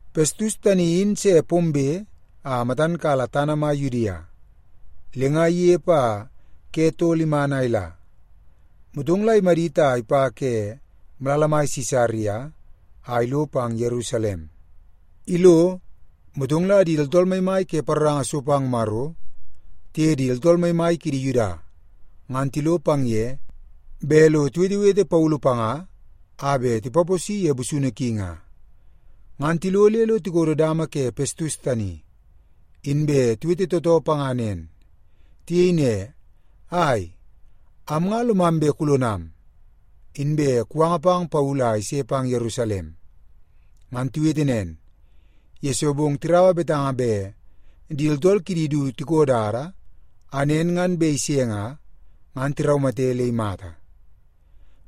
Pestus tani in se pombe a matan kala tana mai Yudia. Le nga inepe a ke tol iman a ila, motong la imadit a ipa ke malala mai Sisaria, a ilo pang Yerusalem. Ilo, motong la di tooltool maimai ke paroranga so pang Maro tiye di tooltool maimai kidi Yuda ngan tilo pang ye bet lo tiwetewete Paulu panga a bet tipaposi ye busunu ki nga. Ngan tilo le lo tikodo dama ke Pestus tani, inbe tiwete tootoo panga nen. Tiyei ne, “Ai, am nga lomam bet kulonam, inbe kuwanga pang Paulu a ise pang Yerusalem.” Ngan tiwete nen, yesoo bong tiraua betanga bet di tooltool kidi du tiko dada a nen ngan bet ise nga, ngan tiraumate le imata.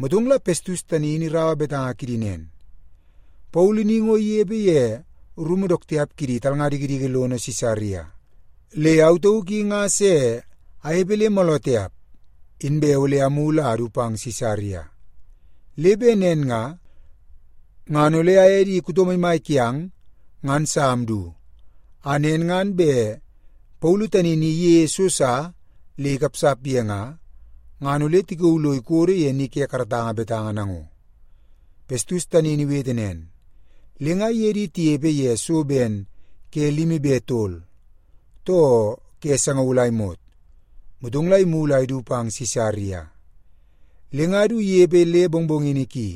Motong la Pestus tani in iraua betanga kidi nen, “Paulu ni ngo inepe ye rumu dook tiap kidi talnga dikidiki lono Sisaria. Le au tauk i nga se anepe le mooloo tiap, inbe ole amulu a adu pang Sisaria. Le bet nen nga, ngan ole aye di kuto maimai kiang ngan sa amdu, a nen ngan bet Paulu tani ni iyeie so sa le ikapsap ye nga, ngan ole tikauu lo ikodo ye ni ke karatanga betanga nango.” Pestus tani in iwete nen, le nga iye di tinepe ye so ben ke limi be tol, too ke sangaul a imot, motong la imulu a idu pang Sisaria. Le nga du inepe le mongmongini ki,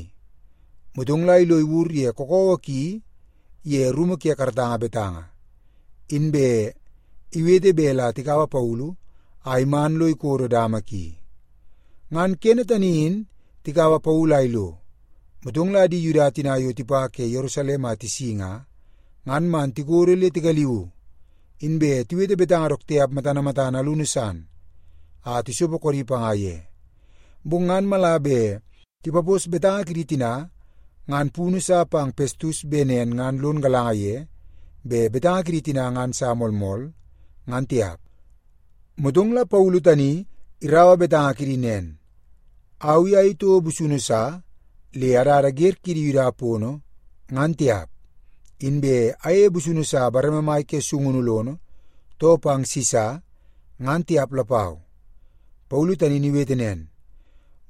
motong la ilo iwur ye kakawa ki ye rumu ke karatanga betanga, inbe iwete bet la tikaua Paulu a iman lo ikodo dama ki. Ngan kene tani in tikaua Paulu a ilo, motong la di Yuda tina yo tipa ke Yerusalem a tisi nga, ngan man tikodo le tigaliu, inbe tiwete betanga dook tiap matana matana alunu san a tisopo koodi panga ye. Bong ngan mala bet tipapos betanga kidi tina ngan punu sa pang Pestus bet nen ngan lon galanga ye bet betanga kidi tina ngan sa moolmool, ngan tiap. Motong la Paulu tani iraua betanga kidi nen, “Au i ayei toko busunu sa le adada wer kidi Yuda pono, ngan tiap. Inbe ayeie busunu sa bareme mai ke sungunu lono, too pang Sisa, ngan tiap lapau.” Paulu tani in iwete nen,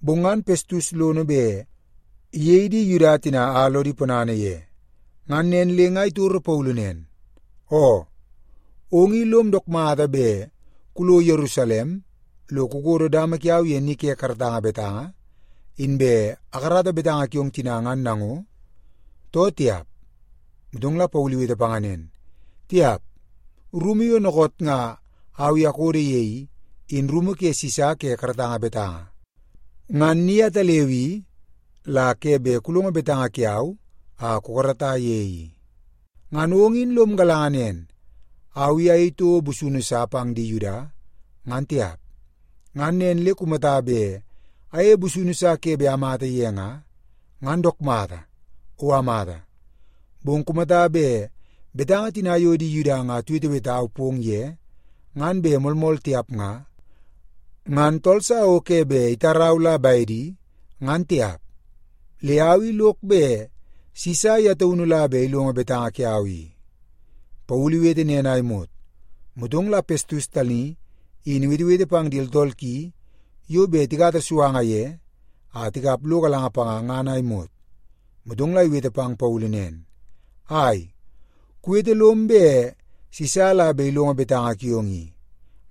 bong ngan Pestus lono bet iyei di Yuda tina a lodi ponana ye. Ngan nen le nga itoro Paulu nen, “Oo, ong i lom dook mata bet kulo Yerusalem lo kukodo dama kiau ye ni ke karatanga betanga, inbe akarata betanga kiong tina ngan nango, too tiap?” Motong la Paulu iwete panga nen, “Tiap! Rumu yo dookoot nga au i akododo ye i, in rumu ke Sisa ke karatanga betanga. Ngan ni ataleu i, la ke bet kulongo betanga kiau a kukarata ye i. Ngan ong in lom galanga nen, au i ayei toko busunu sa pang di Yuda, ngan tiap. Ngan nen le kumata bet ayeie busunu sa ke bet amata ye nga, ngan dook mata, o amata. Bong kumata bet betanga tina yo di Yuda nga tiwetewetau pong ye ngan bet moolmool tiap nga, ngan tool sa o ke bet itarau la bedi, ngan tiap. Le au i lok bet Sisa ye taunu la bet ilongo betanga kiau i.” Paulu iwete nen a imot, motong la Pestus tani in iwetewete pang di tooltool ki yo bet tikata suanga ye a tikap lo galanga panga ngan a imot. Motong la iwete pang Paulu nen, “Ai, kuwete lom bet Sisa la bet ilongo betanga kiong i,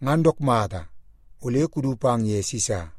ngan dook mata. Ole kudu pang ye Sisa.”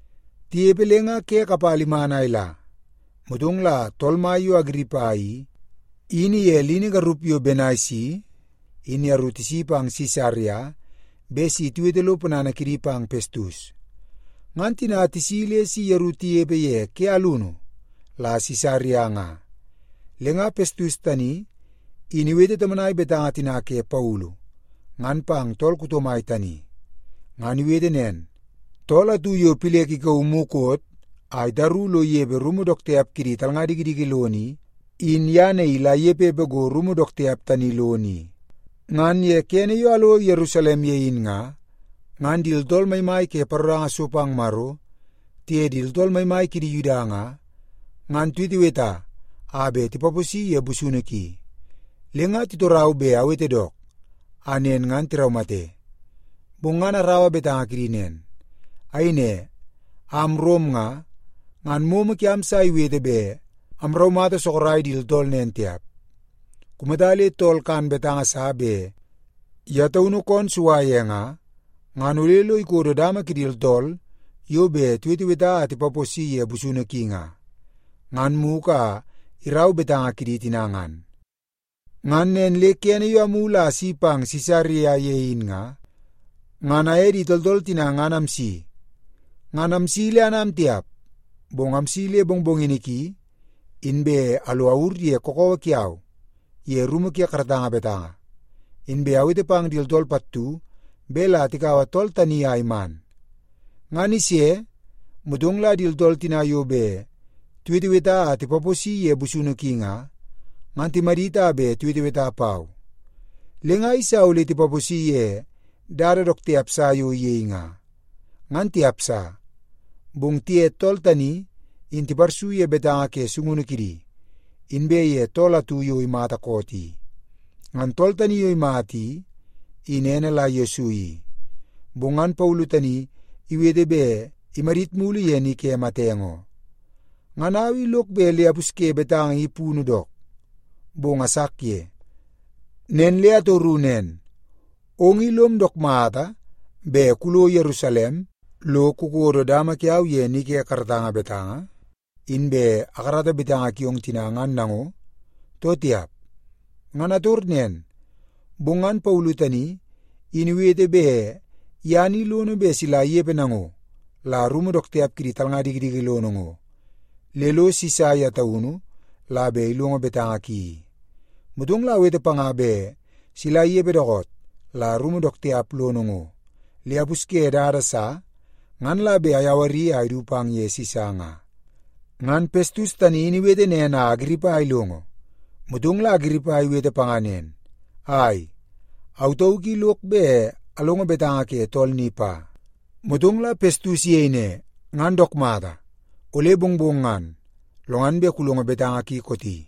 Tinepe le nga ke kapala iman a ila, motong la tool mai yo Agiripa i, in iye lini garup yo Benaisi in yeru tisi pang Sisaria bet si tiwete lo ponana kidi pang Pestus. Ngan tina tisi le si yeru tinepe ye ke alunu la Sisaria nga, le nga Pestus tani in iwete tomonai betanga tina ke Paulu ngan pang tool kuto mai tani. Ngan iwete nen, “Tool atu yo Pilek ikauu mukot a itaru lo inepe rumu dook tiap kidi talnga dikidiki lono i, in ye naii la inepepe go rumu dook tiap tani lono i. Ngan ye kene yo alo Yerusalem ye in nga, ngan di tooltool maimai ke paroranga so pang Maro, tiye di tooltool maimai kidi Yuda nga, ngan tiweteweta a bet tipaposi ye busunu ki. Le nga titorau bet awete dook, a nen ngan tiraumate. Bong ngan araua betanga kidi nen. Ayei ne, ‘Am Rom nga, ngan momo kiam sa iwete bet amraumata sorok di tooltool nen tiap. Kumata le tool kan betanga sa bet ye taunu koon sua ye nga, ngan ole lo ikodo dama kidi tooltool yo bet tiweteweta a tipaposi ye busunu ki nga, ngan mugu a irau betanga kidi tina ngan.’ “Ngan nen le kene yo amulu a asi pang Sisaria ye in nga, ngan aye di tooltool tina ngan amsi. Ngan amsi le anam tiap, bong amsi le mongmongini ki, inbe alo awur ye kakawa kiau ye rumu ke karatanga betanga, inbe awete pang di tooltool pattu bet la tikaua tool tani a iman. Ngan ise, motong la di tooltool tina yo bet tiweteweta a tipaposi ye busunu ki nga, ngan timadit a bet tiweteweta pau. Le nga ayeisa ole tipaposi ye dada dook tiap sa yo iyei nga, ngan tiap sa. Bong tiye tool tani in tiparsu ye betanga ke sungunu kidi, inbe ye tool atu yo imata koot i. Ngan tool tani yo imata i, in ene la Yesu i, bong ngan Paulu tani iwete bet imadit mulu ye ni ke matenge oo. Ngan au i lok bet le apusye betanga i punu dook, bong asak ye. Nen le atoru nen, ‘Ong i lom dook mata bet kulo Yerusalem lo kukodo dama kiau ye ni ke karatanga betanga, inbe akarata betanga kiong tina ngan nango, too tiap?’ Ngan ator nen, bong ngan Paulu tani in iwete bet ye ni lono bet sila inepe nango la rumu dook tiap kidi talnga dikidiki lono ngo, le lo Sisa ye taunu la bet ilongo betanga ki i. Motong la awete panga bet sila inepe dookoot la rumu dook tiap lono ngo, le apusye dada sa, ngan la bet ayawari a idu pang ye Sisa nga.” Ngan Pestus tani in iwete nen a Agiripa ilongo, motong la Agiripa iwete panga nen, “Ai, au tauk i lok bet alongo betanga ke tool ni pa.” Motong la Pestus iyei ne, “Ngan dook mata, ole mongmong ngan, lo ngan bet kulongo betanga ki kooti.”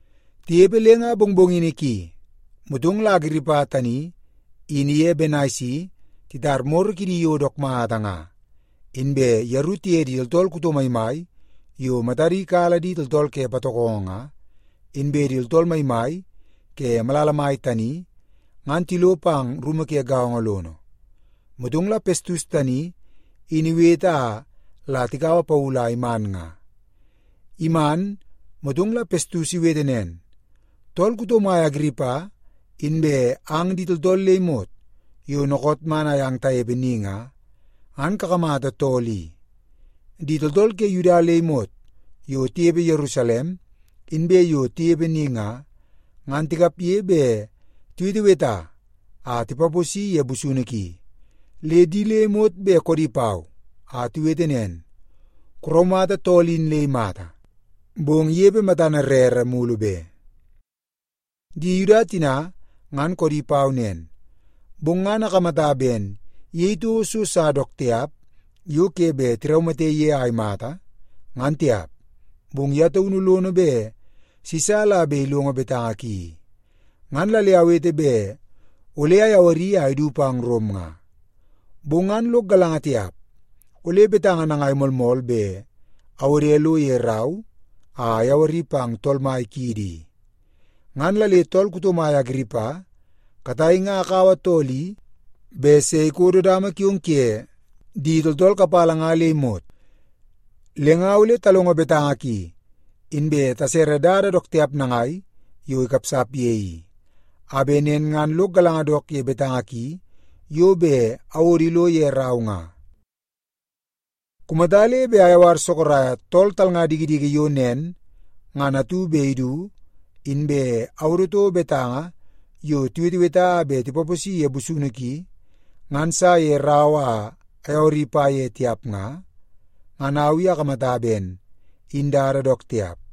Tinepe le nga mongmongini ki, motong la Agiripa tani in iye Benaisi titar moro kidi yo dook mata nga, inbe yeru tiye di tooltool kuto maimai yo matadi kala di tooltool ke patokongo nga, inbe di tooltool maimai ke malala mai tani, ngan tilo pang rumu ke gaongo lono. Motong la Pestus tani in iwete a la tikaua Paulu a iman nga. Iman, motong la Pestus iwete nen, “Tool kuto mai Agiripa, inbe ang di tooltool le imot yo dookoot man amyang tanepe ni nga, ngan kakamata tool i. Di tooltool ke Yuda le imot yo tinepe Yerusalem, inbe yo tinepe ni nga, ngan tikapge bet tiweteweta a tipaposi ye busunu ki. Le di le imot bet koodi pau, a tiwete nen, ‘Kuraumata tool in le imata, bong inepe matana rere mulu be.’ Di Yuda tina ngan koodi pau nen, bong ngan akamata ben iyei toko so sa dook tiap yo ke bet tiraumate ye a imata, ngan tiap. Bong ye taunu lono bet Sisa la bet ilongo betanga ki i. Ngan la le awete bet ole ayawari a idu pang Rom nga. Bong ngan lok galanga tiap, ole betanga nangai moolmool bet awode lo ye rau a ayawari pang tool mai kiidi i. Ngan la le tool kuto mai Agiripa, katai nga akaua tool i bet se ikodo dama kiong kuye di tooltool kapala nga le imot. Le nga ole talongo betanga ki, inbe tasere dada dook tiap nangai yo ikapsap ye i, a bet nen ngan lok galanga dook ye betanga ki yo bet awodo ilo ye rau nga. Kumata le bet ayawara sorok tool talnga dikidiki yo nen ngan atu bet idu, inbe awodo toko betanga yo tiweteweta a bet tipaposi ye busunu ki ngan sa ye rau a ayawari pa ye tiap nga, ngan au i akamata ben in dada dook tiap.”